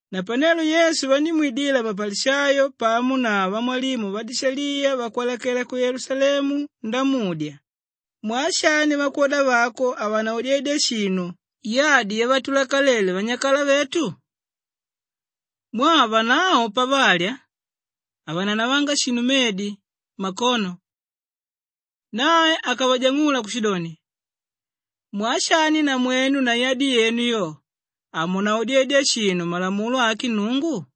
Napanelo Yesu vandímwidila mapalishayo pamo na vamwalimu vadishaliya vakwalakela ku Yelusalemu ndamudya, “Mwaa shani vakwoda vako havanaodedya shinu yadi yavatulakalele vanyakala vetu? Mwaa vanavo pavalya, havananavanga shinu medi mmakono.” Nae akavajang'ula kushidoni, “Mwaa shani namwenu na yadi yenu yo, hamunaodedya shinu malamulo ake Nnungu?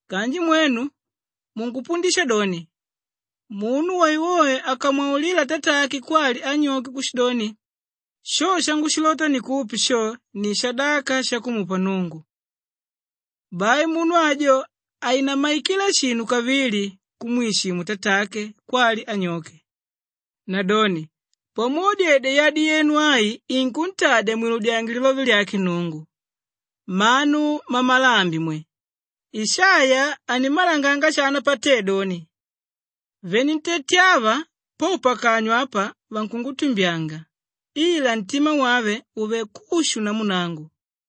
Kanji mwenu munkupundisha doni, ‘Munu woewoe akamwaulila tatake kwali anyoke kushidoni, Sho shangushilota ndikupe sho, ni shadaka shakumupa Nnungu, bai munu ajo hainammaikila shinu kavili kumwishimu tatake kwali anyoke.’ Nadoni pamwodedya yadi yenu ai inkuntadya mwiludyange lilove lyake Nnungu. Mmanu mmamalambi mwe, Ishaiya animmalanganga shana patédoni, “ ‘Venentete ava po pakanywa apa vankungutumbyanga, ila ntima wave uvelé kushu namu nangu.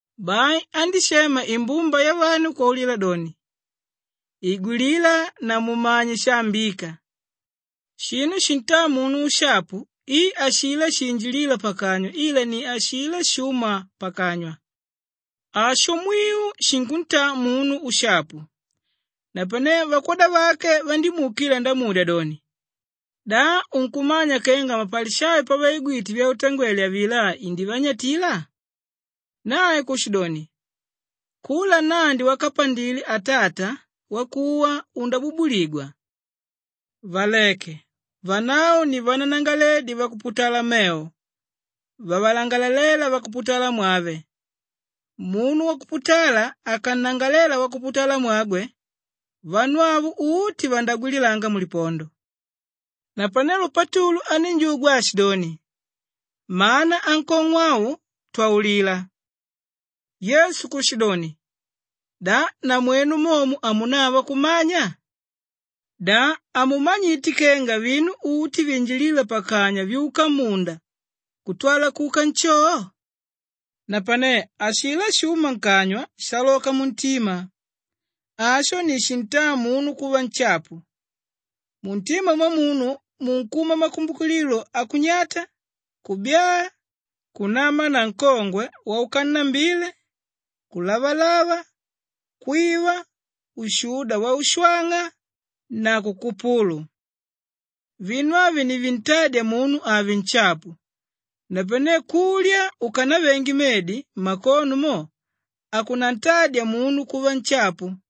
Bai andíshema imbumba yavanu kwaulila doni, “Igwilila na mumanye shaambíka. Shinu shintáa munu ushapu i ashilá shinjilíla pakanywa ila ni ashilá shúma pakanywa. Asho mwiu shinkuntaa munu ushapu.” Napanelo vakwoda vake vandímuukila ndamudya doni, “Da unkumanya kenga mapalishayo pavaigwite vyautangwele avilá indivanyatila?” Nae kushidoni, “Kula nnandi wakapandile Atata wakuwa undabubuligwa. Valeke, vanavo ni vananagalaledi vakuputala mevo vavalangalaléla vakuputalamwave. Munu wakuputala akannangalalela wakuputalamwagwe, vanu avo uti vandagwilangila mulipondo.” Napanelo Patulu anínjugwa aashidoni, “Mana ankong'o au, twaulila.” Yesu kushidoni, “Da namwenu momo hamunava kumanya? Da hamumanyite kenga vinu uti vinjilíla pakanywa vyuka mmunda kutwala kuka nshoo? Napane ashilá shúma nkanywa shaaloka muntima. Asho ni shintádya munu kuva nshapu. Muntima mwamunu munkuma makumbukililo akunyata, kubyaa, kunama nankongwe waukannambile, kulavalava, kwiva, ushuda waushwang'a na kukupulu. Vinu avi ni vintádya munu ave nshapu. Napane kulya ukanavenge medi mmakono mo hakunantadya munu kuva nshapu.”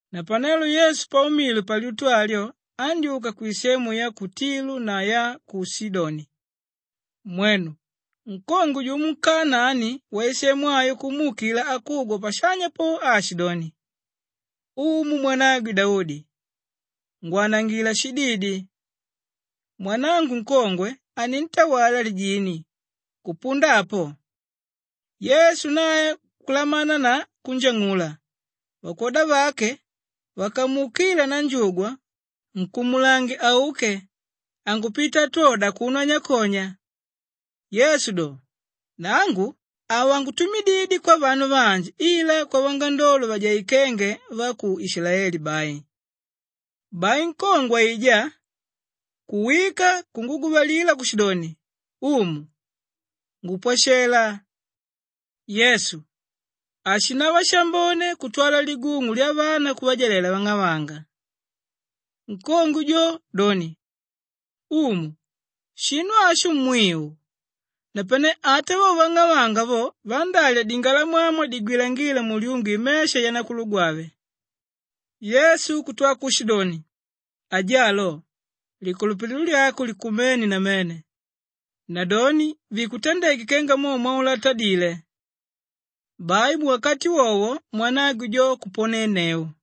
Napanelo Yesu paumile palyutu alyo andyúka kwisemu ya ku Tilu na ya ku Shidoni. Mwenu! Nkongwe jumo nkanaani waisemu ayo kumuukila akugwa pashanya po aashidoni, “Umu, mwanagwe Daudi, ngwanangila shididi! Mwanangu nkongwe anintawala lijini kupunda apo.” Yesu nae kulamana na kunjang'ula. Vakwoda vake vakamuukila nanjugwa, “Nkumulange auke, ankupita atwoda akuno anyakonya.” Yesu do, “Nangu havangutumididye kwavanu vanji ila kwavangandolo vajaikenge va ku Ishilaeli bai.” Bai nkongwe aijá kuwika kunguguvalila kushidoni, “Umu, ngupwashela.” Yesu, “Hashinava shambone kutwala ligung'u lyavana kuvajalela vang'avanga.” Nkongwe jo doni, “Umu, shinu asho mwiu! Napane ata vo vang'avanga vo vandálya dingalamwamwa digwilangíla mulyungu imesha yanakulugwave.” Yesu kutwa kushidoni, “Ajaló, likulupililo lyako likumene namene! Nadoni vikutandeke kenga mo mwaulatadile.” Bai muwakati wowo mwanagwe jo kuponenneu.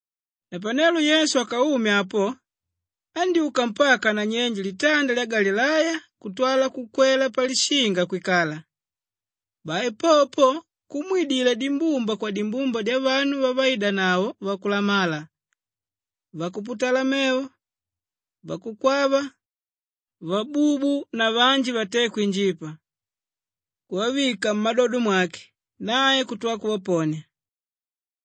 Napanelo Yesu akaume apo andyúka mpaka nanyenje litanda lya Galileya kutwala kukwela palishinga kwikala. Bai popo po kumwidila dimbumba kwadimbumba dyavanu vavaidanavo vakulamala, vakuputala mevo, vakukwava, vabubu na vanji vaté kwinjipa, kuvavika mmadodo mwake, nae kutwala kuvaponia.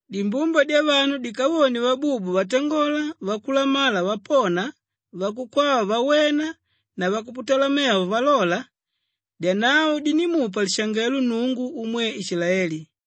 Dimbumba dyavanu dikavone vabubu vatangola vakulamala vapona vakukwava vawena na vakuputala mevo valola, dyanavo dindímupa lishangelo Nnungu umwe Ishilaeli.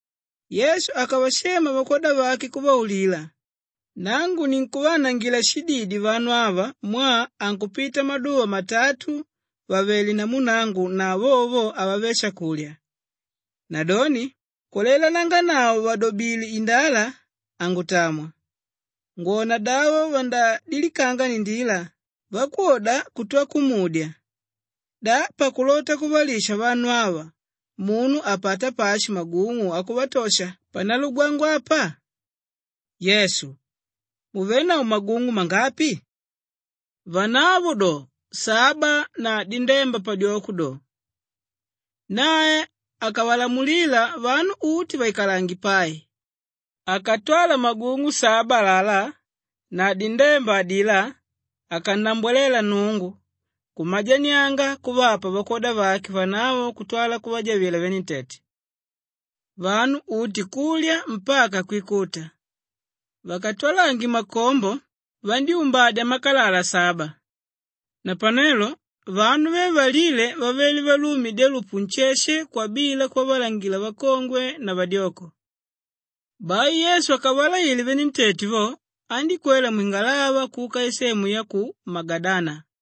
Yesu akavashema vakwoda vake kuvaulila, “Nangu ninkuvaanangila shididi vanu ava mwaa ankupita maduva matatu vàvele namu nangu na vovo vo havavé shakulya. Nadoni kulailananganavo vàdobile indala, hangutamwa ngwonadavo vandadilikanga ndila.” Vakwoda kutwa kumudya, “Da pakulota kuvalisha vanu ava munu apata pashi magung'u akuvatosha panalugwangwa apa?” Yesu, “Muvenavo magung'u mangapi?” Vanavo do, “Saba na dindemba padyoko do.” Nae akavalamulila vanu uti vaikalange pai, akatwala magung'u saba alalá na dindemba adilá akannambwalela Nnungu, kumajanianga kuvapa vakwoda vake vanavo kutwala kuvajavila venentete. Vanu uti kulya mpaka kwikuta. Vakatwalange makombo, vandyúmbadya makalala saba. Napanelo vanu ve valíle vavele valume dyalupu nsheshe kwabila kuvavalangila vakongwe na vadyoko. Bai Yesu akavalaile venentete vo, andíkwela mwingalava kuka isemu ya ku Magadana.